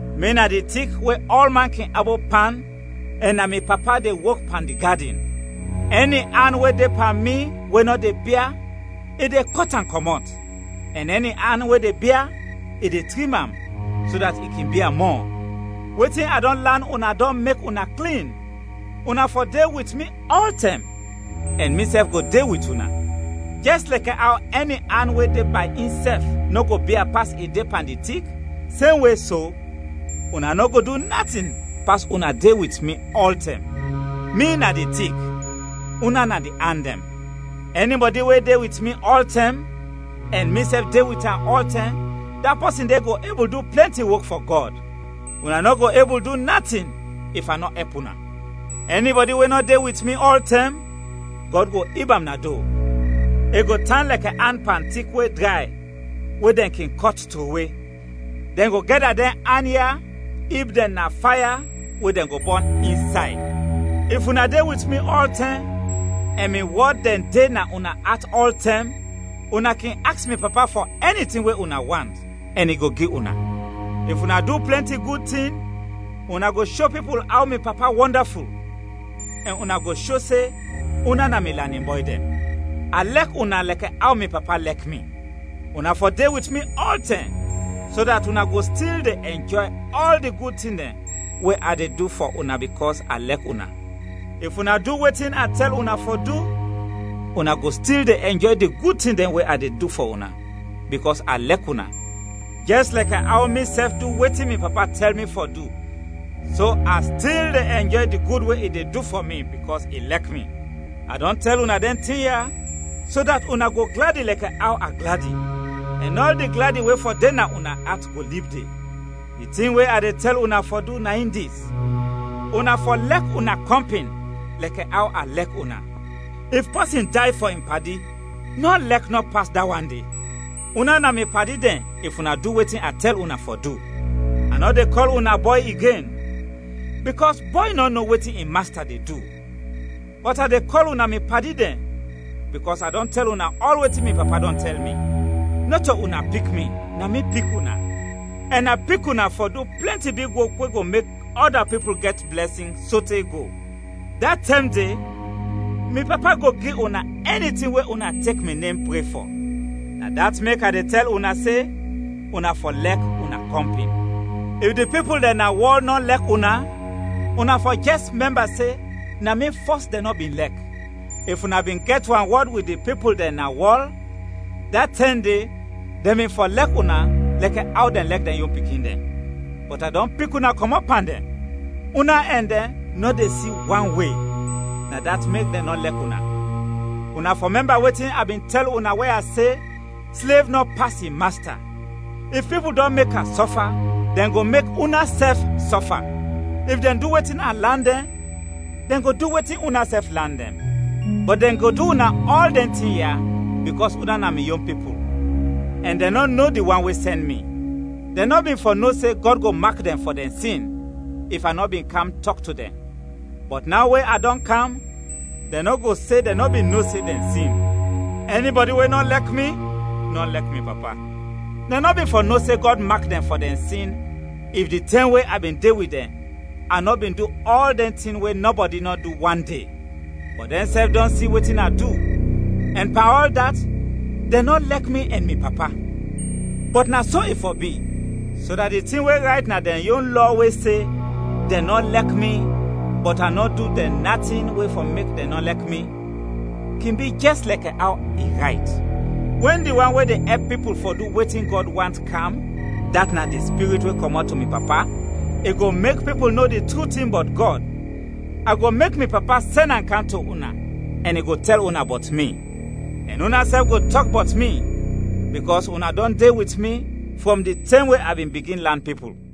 “Mi na di tik we ɔlman kin abop pan ɛn na mi Papa de wok pan di gadin. Ɛni an we de pan mi we nɔ de bia, i de kɔt am kɔmɔt, ɛn ɛni an we de bia, i de trim am, so dat i kin bia mɔ. Wetin a dɔn lan una dɔn mek una klin. Una fɔ de wit mi ɔltɛm, ɛn misɛf go de wit una. Jɛs lɛkɛ aw ɛni an we de bay insɛf nɔ go bia pas i de pan di tik, semwe so, una nɔ go du natin pas una de wit mi ɔltɛm. “Mi na di tik, una na di an dɛn. Ɛnibɔdi we de wit mi ɔltɛm ɛn misɛf de wit am ɔltɛm, da pɔsin de go ebul du plɛnti wok fɔ Gɔd; una nɔ go ebul du natin if a nɔ ɛp una. Ɛnibɔdi we nɔ de wit mi ɔltɛm, Gɔd go ib am na do; i go tan lɛkɛ an pan tik, we dray we dɛn kin kɔt trowe; dɛn go gɛda dɛn an ya ib dɛn na faya, we dɛn go bɔn insay. If una de wit mi ɔltɛm ɛn mi wɔd dɛn de na una at ɔltɛm, una kin aks mi Papa fɔ ɛni tin we una want, ɛn i go gi una. If una du plɛnti gud tin, una go sho pipul aw mi Papa wɔndaful; ɛn una go sho se una na mi lanin bɔy dɛn. A lɛk una lɛkɛ aw mi Papa lɛk mi. Una fɔ de wit mi ɔltɛm, so dat una go stil de ɛnjɔy ɔl di gud tin dɛn we a de du fɔ una bikɔs a lɛk una. If una du wetin a tɛl una fɔ du, una go stil de ɛnjɔy di gud tin dɛn we a de du fɔ una bikɔs a lɛk una, jɛs lɛkɛ aw misɛf du wetin mi Papa tɛl mi fɔ du so a stil de ɛnjɔy di gud we i de du fɔ mi bikɔs i lɛk mi. “A dɔn tɛl una dɛn tin ya so dat una go gladi lɛkɛ aw a gladi, ɛn ɔl di gladi we fɔ de na una at go lib de. Di tin we a de tɛl una fɔ du na in dis: Una fɔ lɛk una kɔmpin lɛkɛ aw a lɛk una. If pɔsin day fɔ in padi, nɔ lɛk nɔ pas da wan de. Una na mi padi dɛn if una du wetin a tɛl una fɔ du. A nɔ de kɔl una bɔy igen, bikɔs bɔy nɔ no wetin in masta de du, bɔt a de kɔl una mi padi dɛn, bikɔs a dɔn tɛl una ɔl wetin mi Papa dɔn tɛl mi. Nɔto una pik mi, na mi pik una; ɛn a pik una fɔ du plɛnti big wok we go mek ɔda pipul gɛt blɛsin sote go. Da tɛm de, mi Papa go gi una ɛni tin we una tek mi nem pre fɔ. Na dat mek a de tɛl una se: Una fɔ lɛk una kɔmpin. “If di pipul dɛn na wɔl nɔ lɛk una, una fɔ jɛs mɛmba se na mi fɔs dɛn nɔ bin lɛk. If una bin gɛt wanwɔd wit di pipul dɛn na wɔl, da tɛm de dɛn bin fɔ lɛk una lɛkɛ aw dɛn lɛk dɛn yon pikin dɛn. Bɔt a dɔn pik una kɔmɔt pan dɛn, una ɛn dɛn nɔ de si wan we, na dat mek dɛn nɔ lɛk una. Una fɔ mɛmba wetin a bin tɛl una we a se: ‘Slev nɔ pas in masta’. If pipul dɔn mek a sɔfa, dɛn go mek unasɛf sɔfa; if dɛn du wetin a lan dɛn, dɛn go du wetin unasɛf lan dɛn. Bɔt dɛn go du una ɔl dɛn tin ya bikɔs una na mi yon pipul, ɛn dɛn nɔ no di wan we sɛn mi. Dɛn nɔ bin fɔ no se Gɔd go mak dɛn fɔ dɛn sin, if a nɔ bin kam tɔk to dɛn, bɔt naw we a dɔn kam, dɛn nɔ go se dɛn nɔ bin no se dɛn sin. Ɛnibɔdi we nɔ lɛk mi, nɔ lɛk mi Papa. Dɛn nɔ bin fɔ no se Gɔd go mak dɛn fɔ dɛn sin if, di tɛm we a bin de wit dɛn, a nɔ bin du ɔl dɛn tin we nɔbɔdi nɔ du wande; bɔt dɛnsɛf dɔn si wetin a du, ɛn pan ɔl dat, dɛn nɔ lɛk mi ɛn mi Papa. Bɔt na so i fɔ bi, so dat di tin we rayt na dɛn yon Lɔ we se: ‘Dɛn nɔ lɛk mi, bɔt a nɔ du dɛn natin we fɔ mek dɛn nɔ lɛk mi,’ kin bi jɛs lɛkɛ aw i rayt. “Wɛn di wan we de ɛp pipul fɔ du wetin Gɔd want, kam, dat na di Spirit we kɔmɔt to mi Papa, i go mek pipul no di tru tin bɔt Gɔd. A go mek mi Papa sɛn am kam to una ɛn i go tɛl una bɔt mi. Ɛn unasɛf go tɔk bɔt mi, bikɔs una dɔn de wit mi frɔm di tɛm we a bin bigin lan pipul.